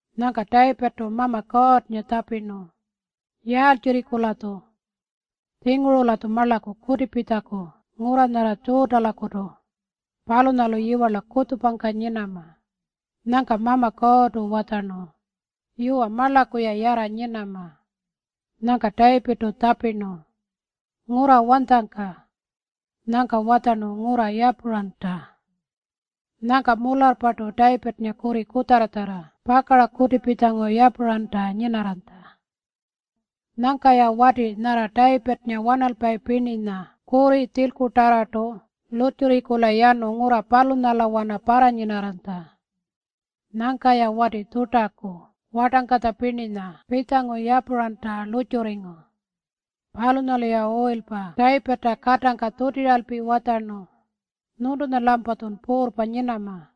Nyangka Tayipirrtu Mama Kuurrnga tjapirnu, “Yaaltjirriku-latju? Tjinguru-latju marlaku kutipitjaku ngurra nyarra Tjuutalakutu. Palunyalu yiwarla kutjupangka nyinama.” Nyangka Mama Kuurrtu watjarnu, “Yuwa, marlaku-ya yarra nyinama.” Nyangka Tayipirrtu tjapirnu, “Ngurra wanytjangka?” Nyangka watjarnu, “Ngurra Yapuranta.” Nyangka mularrpartu Tayipirrnga kurri kutjarratjarra pakara kutipitjangu Yapuranta nyinarranytja. Nyangka-ya wati nyarra Tayipirrnga wanalpayi pirninya kurri tjilkutarrartu lurrtjurringkula yanu ngurra palunyalawana parranyinarranytja. Nyangka-ya wati Tjuutaku wartangkatja pirninya pitjangu Yapuranta lurrtjurringu. Palunyalu-ya uyilpa Tayipirrta katangka tjutiralpi watjarnu, “Nyuntunya-lampatjun puurrpa nyinama.”